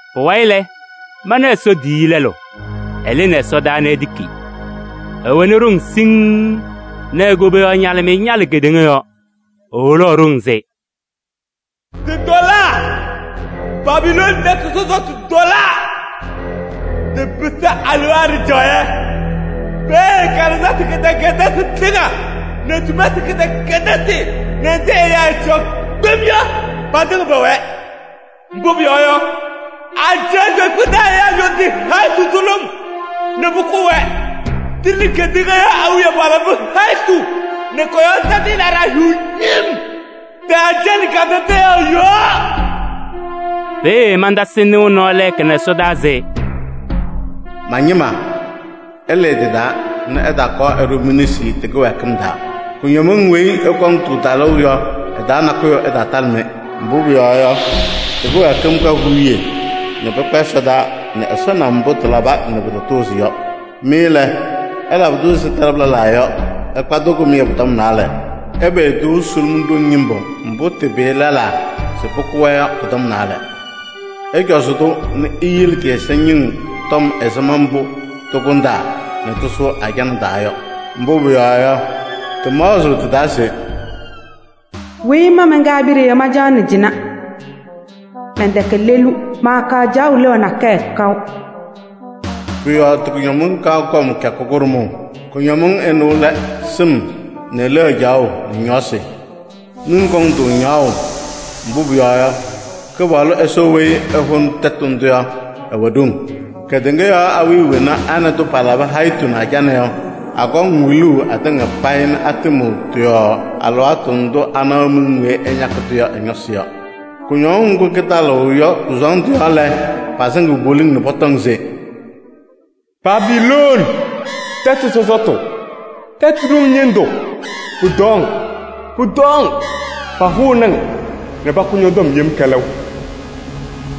Pʋwayɩ lɛ, mana Ɛsɔ tiyiyu lɛlʋ, ɛlɩnɩ ɛsɔdaa nɛ etiki. Ɛwɛnɩ ɖoŋ siŋŋ nɛ e-koboyaɣ ñalɩmɩyɛ ñalɩ kedeŋa yɔɔ. Eholaɣ ɖoŋ se: “Tɩtɔlaa! Babilooni tɛtʋ sɔsɔtʋ tɔlaa! Tɩpɩsɩ alewaa ɖɩjaɣyɛ. Peeye kalɩzasɩ kɩdɛkɛdɩsɩ tɩŋa nɛ sumasɩ kɩdɛkɛdɩsɩ nɛ nzɩ ɛyaa ɛɛcaɣ kpem yɔ patɩŋa pɛwɛɛ. Mbʋ pʋyɔɔ yɔ, ajɛɛ kpeekpe taa ɛyaa ñɔ tɩ-hayitu sʋlʋm nɛ pʋkʋʋ-wɛ. Tɩ nɛ kedeŋa yɔɔ awiya palabɩ hayitu nɛ kɔ-yɔɔ tadɩyɛ laɖaa hiɣ ñɩm tɩ-ajana kadadaɣyaɣ yɔɔ.” Peeye mantasɩ nɩʋ nɔɔ lɛɛka nɛ ɛsɔdaa se: “Ma-ñɩma! Ɩlɩɩ tɩ-taa nɛ ɩtaakɔɔ ɩɖʋ mi-nesi tɩ-kɩwɛɛkɩm taa. Kʋñɔmɩŋ weyi ɩkɔŋ-tʋ talʋʋ yɔ, ɩ-taa nakʋyʋ ɩtaatalɩ-mɩ. Mbʋ pʋyɔɔ yɔ, tɩ-kɩwɛɛkɩm ka huuye nɛ pɩkpa ɛsɔdaa nɛ Ɛsɔ na mbʋ tɩlaba nɛ pɩtatʋʋzɩ yɔ. Mɩ lɛ, ɩlabɩ-tʋ ɛzɩ tɩlabʋ lɛlaa yɔ, ɩkpa-tʋ kɩmɩyɛ pʋ-tɔm naalɛ. Ɩpɩyɩ-tʋ sʋlʋm ɖoŋ ñɩmbʋ mbʋ pɩpɩyɩ lɛlaa se pʋkʋ-wɛ yɔ pʋ-tɔm naalɛ. Ɩcɔzɩ-tʋ nɛ iyele tɩ-ɛza ñɩŋ tɔm ɛzɩma mbʋ tɩkʋndaa nɛ tɩsʋʋ ajana taa yɔ! Mbʋ pʋyɔɔ yɔ, tɩmaɣzɩɣ tɩ-taa se: ‘Weyi ma mɛnkɛ abiɖe yɔ, mancaɣnɩ cɩnɛ. Mɛntɛkɛ lelu, maakaɣ caɣʋ leɣa nakɛyɛ kaʋ.’ Pʋ-yɔɔ tɩ-kʋñɔmɩŋ kaɣ kɔm kɩyakʋ kʋɖʋmʋʋ. Ɩnʋ lɛ: sɩm nɛ leɣa caɣʋ nɛ ñɔɔsɩ. Miŋ kɔŋ-tʋ ñaɣʋʋ, mbʋ pʋyɔɔ yɔ, Kɩpaɣlʋ Ɛsɔ weyi ɛhʋnɩ tɛtʋ ndʋ yɔ, ɛwɛ ɖoŋ. “Kedeŋa yɔɔ awiya wena a nɛ tʋ palabɩ hayitu nɛ ajana yɔ, akɔŋ wiluu atɩŋa payɩ nɛ atɩmɩɣ tɩ-yɔɔ alɩwaatʋ ndʋ anaɣ miŋ weyi ɛñakɩ-tʋ yɔ ɛ-ñɔsɩ yɔ. Kʋñɔŋ ŋgʋ kɩtalɩɣ-tʋ yɔ kʋ-sɔɔndʋ yɔɔ lɛ, pasɩŋɩɣ poliŋ nɛ pɔtɔŋ se: ‘Babilooni tɛtʋ sɔsɔtʋ, tɛtʋ ɖoŋ ñɩndʋ, pʋtɔɔ-ŋ! Pʋtɔɔ-ŋ! Pahʋnɩ-ŋ nɛ pakʋ ñɔ-tɔm yem kɛlɛʋ!’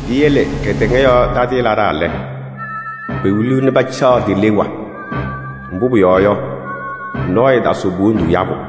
“Piyele kedeŋa yɔɔ tadɩyɛ laɖaa lɛ, pewiliɣ nɛ pacaɣ ti-leɣa. Mbʋ pʋyɔɔ yɔ, nɔɔyʋ ɛɛtasɩɣ po-wondu yabʋ.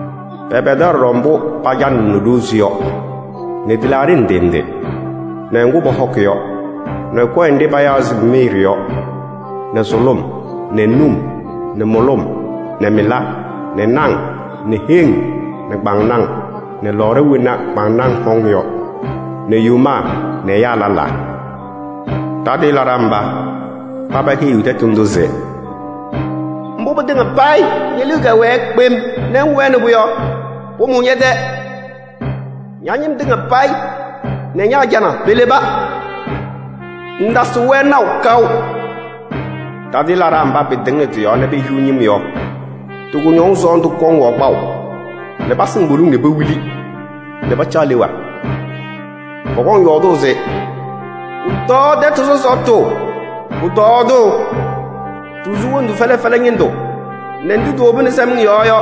Pɛpɛdaɣ ɖɔɖɔ mbʋ pacanɩɣnɩ ɖozi yɔ nɛ tɩlaaɖɩ ndɩ ndɩ nɛ ŋgʋ pɔhɔkɩ yɔ nɛ kɔyɛ nɖɩ payaɣ se miiri yɔ nɛ sʋlʋm nɛ num nɛ mʋlʋm nɛ mɩla nɛ naŋ nɛ heŋ nɛ kpaŋnaŋ nɛ lɔɔɖa wena kpaŋnaŋ hɔŋ yɔ nɛ yomaa nɛ ɛyaa lɛlaa. Tadɩyɛ laɖaa mba, paba heyiɣ tɛtʋ ndʋ se: ‘Mbʋ pɩtɩŋa payɩ ñe-liu kɛwɛɛ kpem nɛ ŋwɛnɩ-pʋ yɔ, pʋmʋʋ ñɛ-tɛ. Ña-ñɩm tɩŋa payɩ nɛ ña-ajana peleba. Ŋŋtasɩɣ-wɛ naʋ kaʋ.’ Tadɩyɛ laɖaa mba pɩtɩŋnɩ tɩ-yɔɔ nɛ pehiɣ ñɩm yɔ, tɩ-kʋñɔŋ sɔɔndʋ kɔŋ-wɛ kpaʋ nɛ pasɩŋ poliŋ nɛ pewili nɛ pacaɣ leɣa. Pɔkɔŋ yɔɔdʋʋ se: ‘Pʋtɔɔ tɛtʋ sɔsɔtʋ! Pʋtɔɔ-tʋ! Tisu wondu fɛlɛ fɛlɛ ñɩndʋ nɛ ndʋ tiwobini sɛmɩŋ yɔɔ yɔ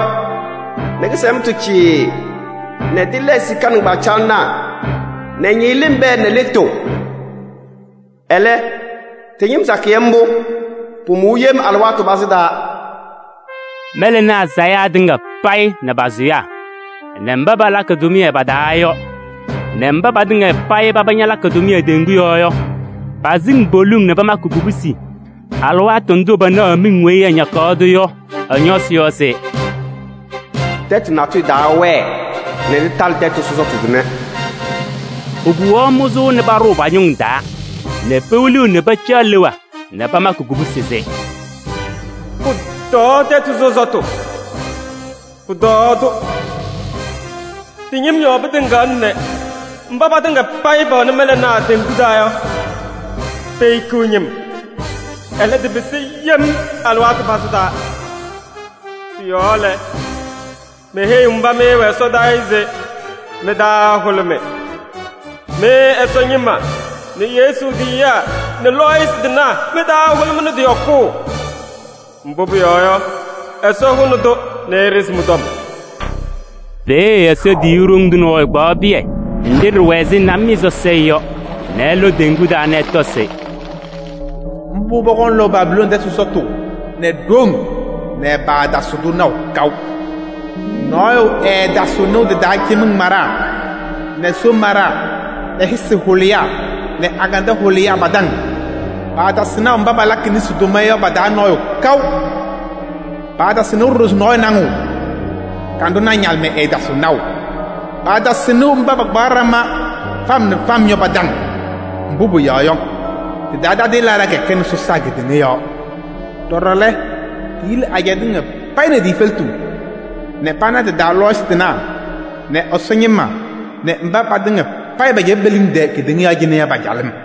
nɛ kɩsɛmtʋ cɩɩɩ nɛ tɩlɛɛ sika nɩŋgbacaɣlɩnaa nɛ ñɩɣlɩm pɛɛ nɛ lɩtʋ. Ɛlɛ tɩ-ñɩm sakɩyɛ mbʋ, pʋmʋʋ yem alɩwaatʋ pazɩ taa.’ “Mɛlɛnaa sayaa tɩŋa payɩ nɛ pa-sʋyaa nɛ mba palakɩ tʋmɩyɛ pa-taa yɔ nɛ mba patɩŋa payɩ paba ñalakɩ tʋmɩyɛ teŋgu yɔɔ yɔ, pasɩŋ poliŋ nɛ pamakɩ kubusi alɩwaatʋ ndʋ panaɣaɣ miŋ weyi ɛñakɩ-tʋ yɔ ɛ-ñɔsɩ yɔ se: ‘Tɛtʋ natʋyʋ taawɛɛ nɛ tɩtalɩ tɛtʋ sɔsɔtʋ tʋnɛ!’ Pokuwaɣ mʋzʋʋ nɛ paɖʋʋ pa-ñʋŋ taa nɛ pewiliɣ nɛ pacaɣ leɣa nɛ pamakɩ kubusi se: ‘Pʋtɔɔ tɛtʋ sɔsɔtʋ! Pʋtɔɔ-tʋ! Tɩ-ñɩm yɔɔ pɩtɩŋaɣna nɛ mba patɩŋa payɩ pɛwɛnɩ mɛlɛnaa teŋgu taa yɔ, pehikiɣ ñɩm. Ɛlɛ tɩpɩsɩ yem alɩwaatʋ pazɩ taa!’” Pʋ-yɔɔ lɛ, meheyiɣ mba mɩ ɩwɛ ɛsɔdaa yɔ se mɩ-taa ɛhʋlʋmɩ! Mɩ Ɛsɔ ñɩma nɛ Yesu tiyiyaa nɛ lɔɔyɩsɩ tɩnaa mɩ-taa ɛhʋlʋmɩnɩ tɩ-yɔkʋʋ! Mbʋ pʋyɔɔ yɔ, Ɛsɔ hʋnɩ-tʋ nɛ eɖezi mɩ-tɔm. Peeye Ɛsɔ tiyiyu ɖoŋ tʋ nɔɔyʋ kpaɣ pɩyɛ nɖɩ ɖɩwɛ ɛzɩ namɩyɛ sɔsɔɖɛ yɔ nɛ ɛlɔ teŋgu taa nɛ ɛtɔ se: “Mbʋ pɔkɔŋ lɔʋ Babilooni tɛtʋ sɔsɔtʋ nɛ ɖoŋ nɛ paatasɩɣ-tʋ naʋ kaʋ. Nɔɔyʋ ɛɛtasɩɣ nɩʋ tɩ-taa cɩmɩŋ maɖaa nɛ soo maɖaa nɛ hɩsɩ hʋlɩyaa nɛ agandɛɛ hʋlɩyaa pa-taŋ. Paatasɩɣ naʋ mba palakɩ nesi tʋma yɔ pa-taa nɔɔyʋ kaʋ. Paatasɩɣ nɩʋ ɖɔɖɔ se nɔɔyʋ naŋɩɣ. Kanɖʋnaa ñalɩmɩyɛ ɛɛtasɩɣ naʋ. Paatasɩɣ nɩʋ mba pakpaɣ ɖama fam nɛ fam yɔ pa-taŋ. Mbʋ pʋyɔɔ yɔ, tɩ-taa tadɩyɛ laɖaa kɛkɛnɩ sɔsaa kedeŋa yɔɔ. Ɖɔɖɔ lɛ, tiyili ajɛɛ tɩŋa payɩ nɛ ti-efeletu nɛ pana tɩ-taa lɔɔyɩsɩ tɩnaa nɛ Ɛsɔ ñɩma nɛ mba patɩŋa payɩ pɛcɛbɩ pe-liŋ tɛɛ kedeŋa yɔɔ cɩnɛ yɔ pa-calɩm.”